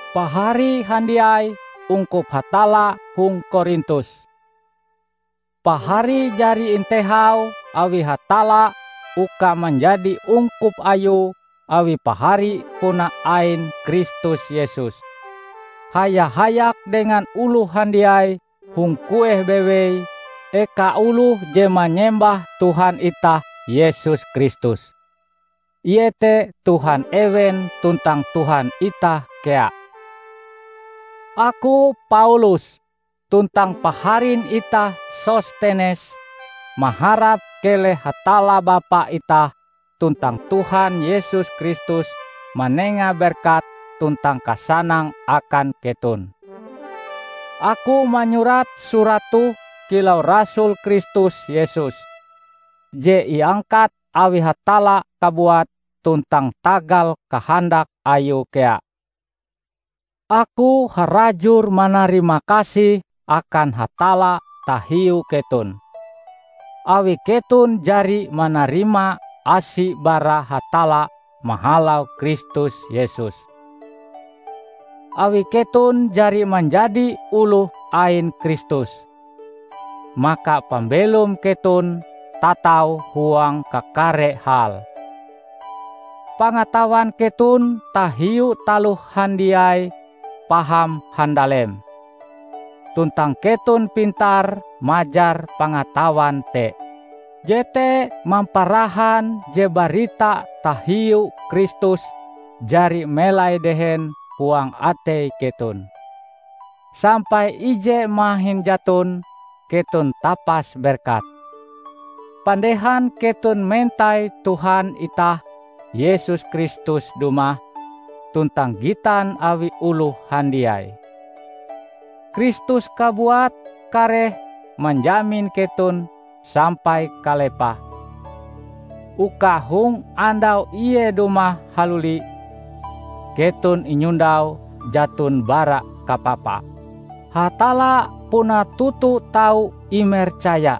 Pahari handiai ungkup Hatalla hong Korintus! Pahari jari intehau awi Hatalla uka manjadi ungkup Ayue awi pahari puna ain Kristus Yesus, haya-hayak dengan oloh handiai hong kueh bewei eka oloh je manyembah Tuhan itah Yesus Kristus, iete Tuhan ewen tuntang Tuhan itah kea. Aku Paulus, tuntang paharin itah Sostenes, maharap keleh Hatalla Bapa itah tuntang Tuhan Yesus Kristus manenga berkat tuntang kasanang akan keton. Aku manyurat surat toh kilau rasul Kristus Yesus, je iangkat awi Hatalla kabuat tuntang tagal kahandak Ayue kea. Aku harajur manarimakasih akan Hatalla tahiu keton, awi keton jari manarima asi bara Hatalla mahalau Kristus Yesus. Awi keton jari manjadi oloh ain Kristus, maka pambelom keton tatau huang kakare hal. Pangatawan keton tahiu taloh handiai paham handalem, tuntang keton pintar majar pangatawan te. Jete mamparahan je barita tahiu Kristus jari melai dehen huang atei keton, sampai ije mahin jaton keton tapas berkat, pandehan keton mentai Tuhan itah Yesus Kristus dumah tuntang gitan awi oloh handiai. Kristus kabuat kareh manjamin keton sampai kalepahe; uka hong andau ie dumah haluli, keton inyondau jaton bara kapapa. Hatalla puna toto tau imercaya.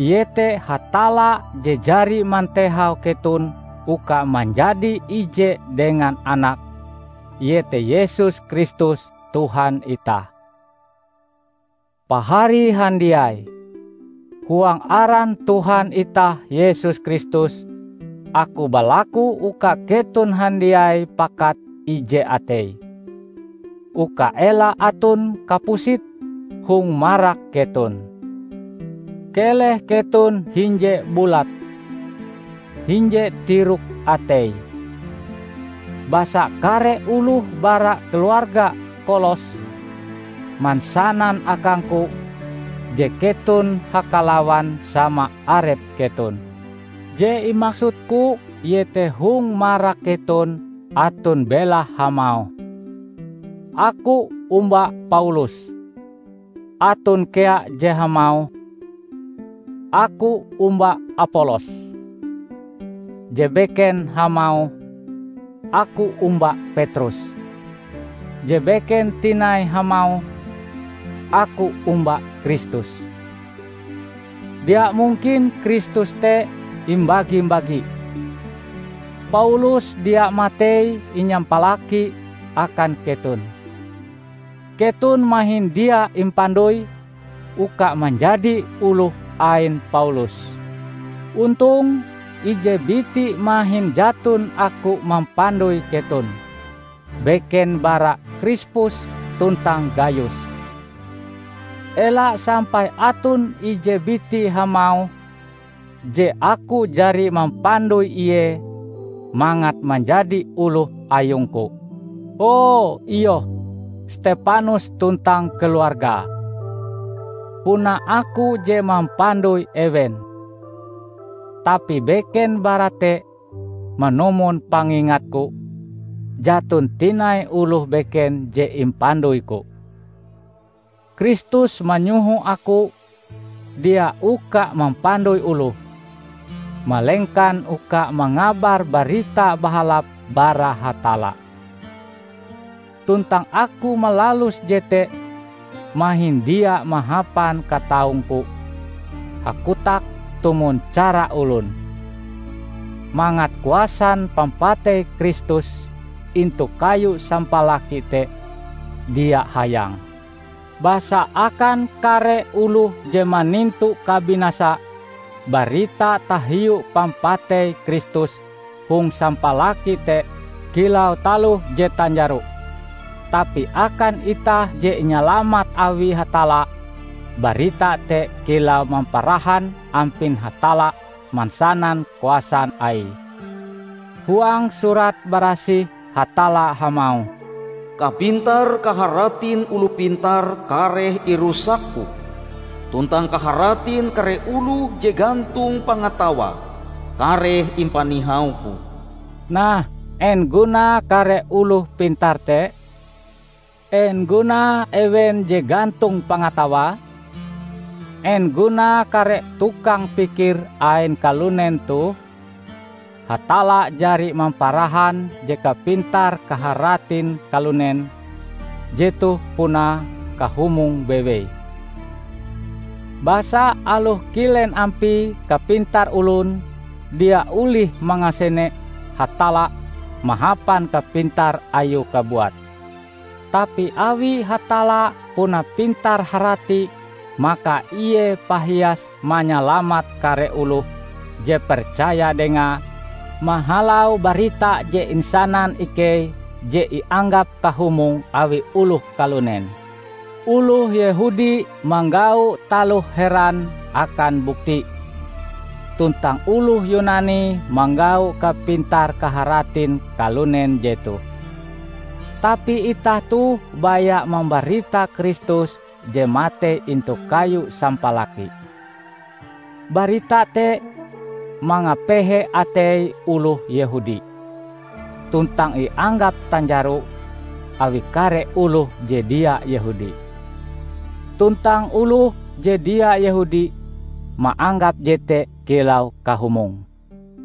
Ie te Hatalla je jari mantehau keton uka manjadi ije dengan Anake, iete Yesus Kristus Tuhan itah. Pahari handiai! Huang aran Tuhan itah Yesus Kristus, aku balaku uka keton handiai pakat ije atei; uka ela aton kapusit hong marak keton. Keleh keton hinje bulat, hinje tirok atei. Basa kare oloh bara keluarga Kolos mansanan akangku je keton hakalawan sama arep keton. Je imaksudku iete hong marak keton aton belahe hamauh, "Aku omba Paulus," aton kea je hamauh, "Aku omba Apolos," je beken hamauh, "Aku omba Petrus," je beken tinai hamauh, "Aku omba Kristus." Dia mungkin Kristus te imbagi-bagi! Paulus dia matei inyampalaki akan keton! Keton mahin dia impandoi uka manjadi oloh ain Paulus. Ontong, ije biti mahin jaton aku mampandoi keton, beken bara Krispus tuntang Gayus. Ela sampai aton ije biti hamauh je aku jari mampandoi ie mangat manjadi oloh ayungku. ( O, iyoh! Stepanus tuntang keluargae, puna aku je mampandoi ewen. Tapi beken bara te, manumon pangingatku, jaton tinai oloh beken je impandoiku.) Kristus manyoho aku dia uka mampandoi oloh, malengkan uka mangabar Barita Bahalap bara Hatalla; tuntang aku malalus jete mahin dia mahapan kataungku hakotak tumon cara olon, mangat kuasan pampatei Kristus intu kayu sampalaki te dia hayang. Basa akan kare oloh je manintu kabinasa, barita tahiu pampatei Kristus hong sampalaki te kilau taloh je tanjaro. Tapi akan itah je inyalamat awi Hatalla, barita te kilau mamparahan ampin Hatalla mansanan kuasan Aie. Huang Surat Barasih Hatalla hamauh, "Kapintar-kaharatin oloh pintar kareh irusak-Ku, tuntang kaharatin kare oloh je gantong pangatawae kareh impanihau-Ku." Nah, en gunae kare oloh pintar te? En gunae ewen je gantong pangatawae? En gunae kare tukang pikir ain kalunen toh? Hatalla jari mamparahan je kapintar-kaharatin kalunen jetoh puna kahumong bewei! Basa aloh kilen ampie kapintar olon, dia olih mangasene Hatalla mahapan kapintar ayue kabuat. Tapi awi Hatalla puna pintar-harati maka Ie pahias manyalamat kare oloh je percaya Dengae mahalau barita je insanan ikei je ianggap kahumong awi oloh kalunen. Oloh Yehudi manggau taloh heran akan bukti, tuntang oloh Yunani manggau kapintar-kaharatin kalunen jetoh. Tapi itah toh baya mambarita Kristus je matei intu kayu sampalaki. Barita te mangapehe atei oloh Yehudi, tuntang ianggap tanjaro awi kare oloh je dia Yehudi. Tuntang oloh je dia Yehudi maanggap jete kilau kahumong.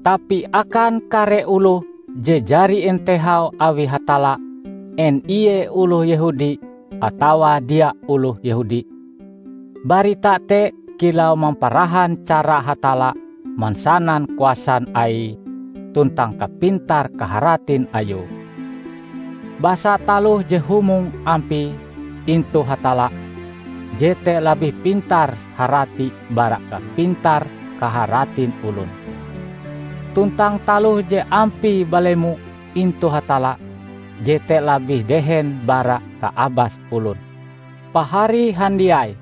Tapi akan kare oloh je jari intehau awi Hatalla en ie oloh Yehudi atawa dia oloh Yehudi -- barita te kilau mamparahan cara Hatalla mansanan kuasan Aie tuntang kapintar-kaharatin Ayue. Basa taloh je humong ampie intu Hatalla, jete labih pintar-harati bara kapintar-kaharatin olon; tuntang taloh je ampie balemo intu Hatalla, jete labih dehen bara kaabas olon. Pahari handiai!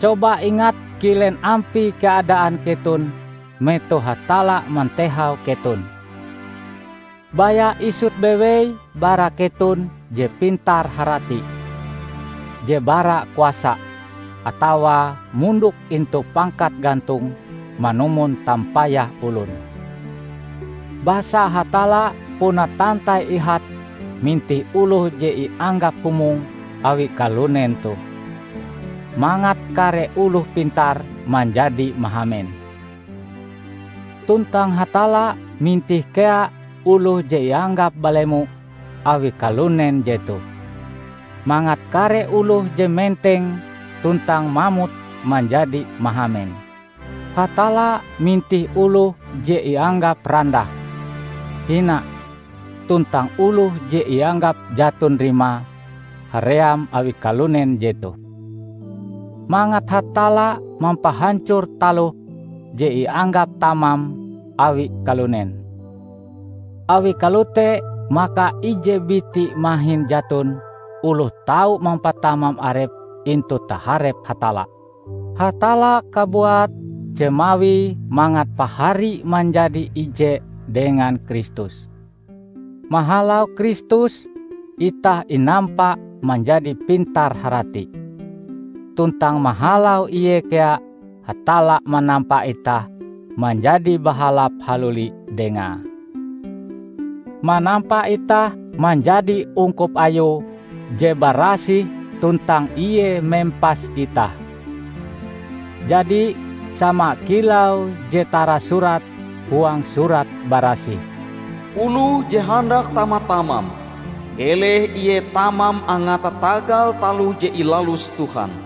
Coba ingat kilen ampie keadaan keton metoh Hatalla mantehau keton. Baya isut bewei bara keton je pintar-harati, je bara kuasa, atawa mondok intu pangkat gantong manumon tampayah olon. Basa Hatalla puna tantai ihate mintih oloh je ianggap humong awi kalunen toh, mangat kare oloh pintar manjadi mahamen. Tuntang Hatalla mintih kea oloh je ianggap balemo awi kalunen jetoh, mangat kare oloh je menteng tuntang mamut manjadi mahamen. Hatalla mintih oloh je ianggap randah, hina, tuntang oloh je ianggap jaton rimae haream awi kalunen jetoh, mangat Hatalla mampahancor taloh je ianggap tamam awi kalunen. Awi kalote maka ije biti mahin jaton oloh tau mampatamam arepe intu taharep Hatalla. Hatalla kabuat je mawie mangat pahari manjadi ije dengan Kristus. Mahalau Kristus, itah inampa manjadi pintar-harati. Tuntang mahalau Ie kea Hatalla manampa itah manjadi bahalap haluli Dengae, manampa itah manjadi ungkup Ayue je barasih tuntang Ie mempas itah. Jadi, sama kilau je tarasurat huang Surat Barasih, "Oloh je handak tama-tamam, keleh ie tamam angate tagal taloh je ilalus Tuhan."